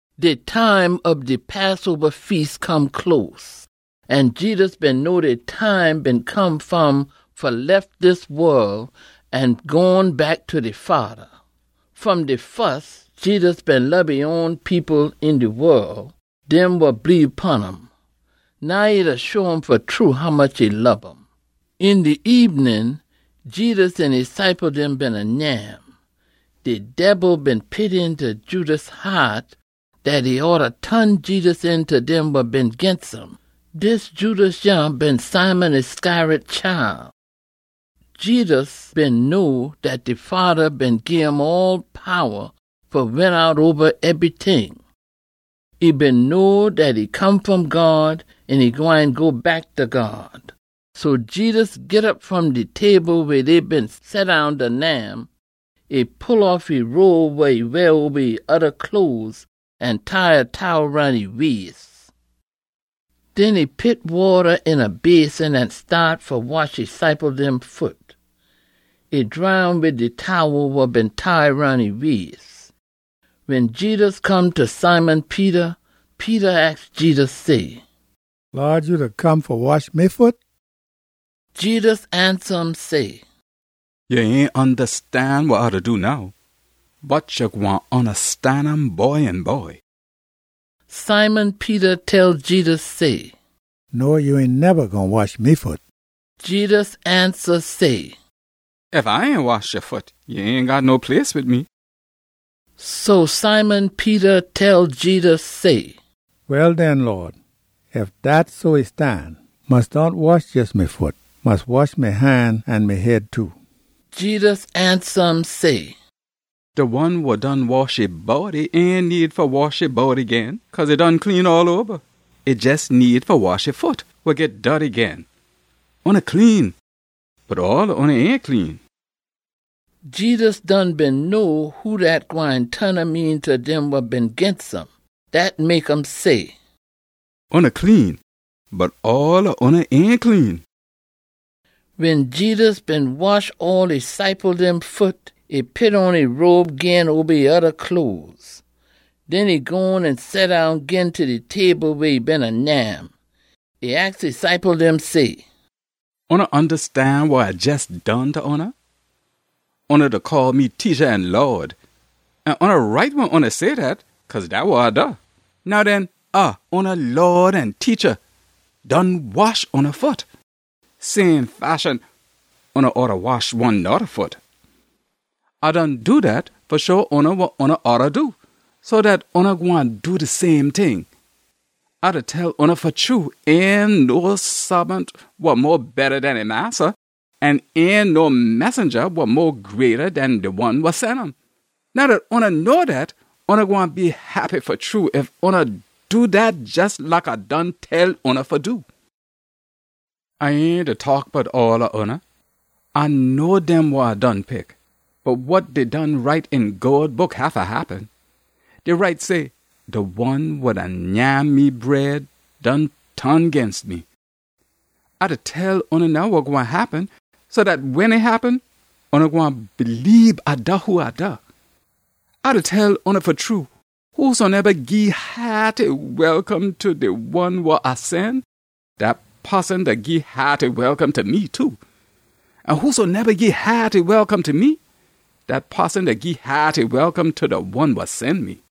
De time ob de Passoba Feas come close, an Jedus been know de time been come fa um fa lef dis wol an gone back ta de Fada. Fom de fus, Jedus been lob e own people een de wol, dem wa bleebe pon um. Now e da show um fa true hommuch e lob um. Een de ebenin, Jedus an e ciple dem beena nyam. De Debil been pit eenta Judas haat dat e oughta ton Jedus een ta dem wa been ginst um. Dis Judas yah been Simon Iscariot chile. Jedus been know dat de Fada been gim all powa fa win out oba ebryting. E been know dat e come fom God an e gwine go back ta God. So Jedus git op fom de table weh dey been seddown da nyam. E pull off e robe wa e weah oba e oda cloes, an tie a towel roun e wais. Den e pit wata een a basin an staat fa wash e ciple dem foot. E dry um wid de towel wa been tie roun e wais. Wen Jedus come ta Simon Peter, Peter aks Jedus say, “Lawd, ya da come fa wash me foot?” Jedus ansa um say, “Ya ain ondastan wa A da do now. Bot ya gwine ondastan um by an by.” Simon Peter tell Jedus say, “No, ya ain neba gwine wash me foot!” Jedus ansa say, “Ef A ain wash ya foot, ya ain got no place wid me.” So Simon Peter tell Jedus say, “Well den, Lawd, ef dat so e stan, mus dohn wash jes me foot. Mus wash me han an me head too!” Jedus ansa um say, “De one wa done wash e body ain need fa wash e body gin, cause e done clean all oba. E jes need fa wash e foot, wa git dorty gin. Oona clean, bot all ob oona ain clean.” Jedus done been know who dat gwine ton um een ta dem wa been ginst um. Dat mek um say, “Oona clean, bot all ob oona ain clean.” Wen Jedus been wash all de ciple dem foot, e pit on e robe gin oba e oda cloes. Den e gone an seddown gin ta de table weh e beena nyam. E aks e ciple dem say, “Oona ondastan wa A jes done ta oona? Oona da call me Teacha an Lawd, an oona right wen oona say dat, cause dat wa A da. Now den, A, oona Lawd an Teacha, done wash oona foot. Same fashion, oona oughta wash one noda foot. A done do dat fa show oona wa oona oughta do, so dat oona gwine do de same ting. A da tell oona fa true, ain no saabant wa mo betta den e massa, an ain no messenja wa mo greata den de one wa sen um. Now dat oona know dat, oona gwine be heppy fa true ef oona do dat jes like A done tell oona fa do. “A ain da taak bout all ob oona. A know dem wa A done pick. Bot wa dey done write een God Book haffa happen. Dey write say, ‘De one wa da nyam me bread done ton ginst me.’ A da tell oona now wa gwine happen, so dat wen e happen, oona gwine bleebe A da who A da. A da tell oona fa true, whosoneba gii haaty welcome ta de one wa A sen, dat poson da gii haaty welcome ta me too. An whosoneba gii haaty welcome ta me, dat poson da gii haaty welcome ta de one wa sen me.”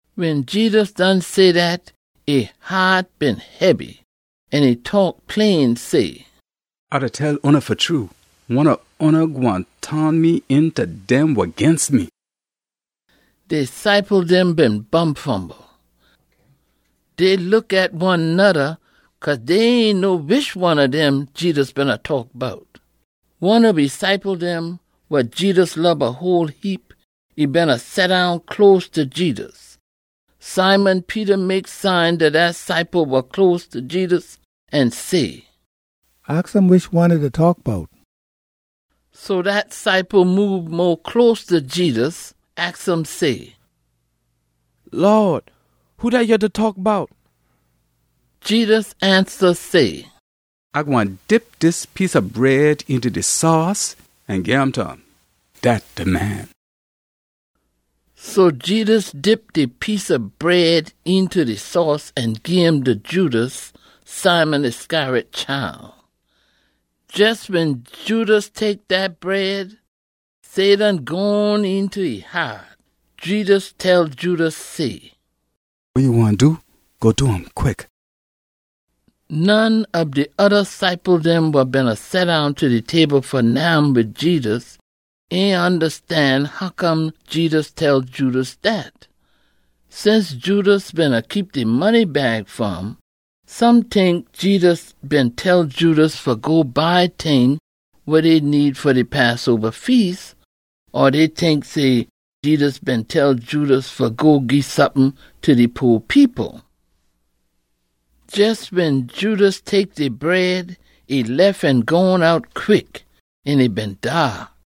Wen Jedus done say dat, e haat been hebby. An e taak plain say, “A da tell oona fa true, one ob oona gwine ton me een ta dem wa ginst me.” De ciple dem been bumfumble. Dey look at one noda, cause dey ain know wish one ob dem Jedus beena taak bout. One ob e ciple dem, wa Jedus lob a whole heap, e beena seddown close ta Jedus. Simon Peter mek sign ta dat ciple wa close ta Jedus an say, “Aks um wish one e da taak bout.” So dat ciple moob mo close ta Jedus, aks um say, “Lawd, who dat ya da taak bout?” Jedus ansa say, “A gwine dip dis piece ob bread eenta de sauce an gim ta um. Dat de man.” So Jedus dip de piece ob bread eenta de sauce an gim ta Judas, Simon Iscariot chile. Jes wen Judas tek dat bread, Satan gone eenta e haat. Jedus tell Judas say, “Wa ya gwine do, go do um quick!” None ob de oda ciple dem wa beena seddown ta de table fa nyam wid Jedus ain ondastan hoccome Jedus tell Judas dat. Since Judas beena keep de money bag fa um, some tink Jedus been tell Judas fa go buy ting wa dey need fa de Passoba Feas, or dey tink say Jedus been tell Judas fa go gii sompin ta de po people. Jes wen Judas tek de bread, e lef an gone out quick, an e been daak.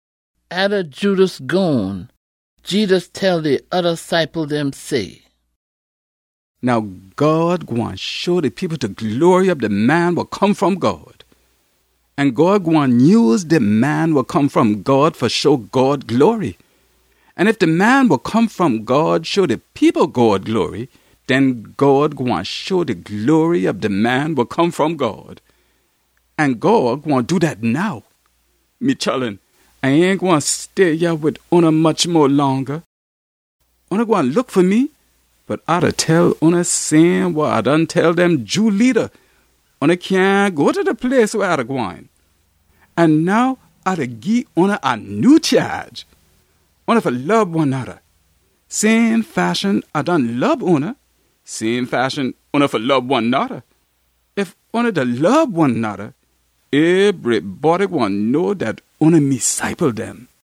Atta Judas gone, Jedus tell de oda ciple dem say, “Now God gwine show de people de glory ob de Man wa Come fom God. An God gwine nyuse de Man wa Come fom God fa show God glory. An ef de Man wa Come fom God show de people God glory, den God gwine show de glory ob de Man wa Come fom God. An God gwine do dat now. Me chullun, A ain gwine stay yah wid oona much mo longa. Oona gwine look fa me, bot A da tell oona same wa A done tell dem Jew leada, ‘Oona cyahn go ta de place weh A da gwine.’ An now A da gii oona a nyew chaage. Oona fa lob one noda. Same fashion A done lob oona, same fashion oona fa lob one noda. Ef oona da lob one noda, ebrybody gwine know dat oona me ciple dem.”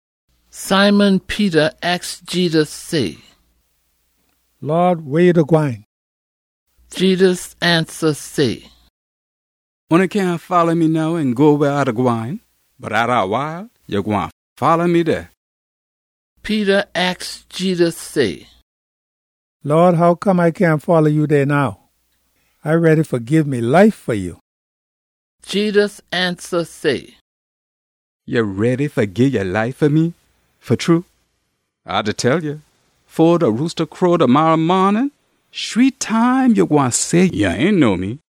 Simon Peter aks Jedus say, “Lawd, weh ya da gwine?” Jedus ansa say, “Oona cyahn folla me now an go weh A da gwine. Bot atta a wile, ya gwine folla me dey.” Peter aks Jedus say, “Lawd, hoccome A cyahn folla ya dey now? A ready fa gii me life fa ya!” Jedus ansa say, “Ya ready fa gii ya life fa me, fa true? A da tell ya, fo de roosta crow demarra maanin, shree time ya gwine say ya ain know me.”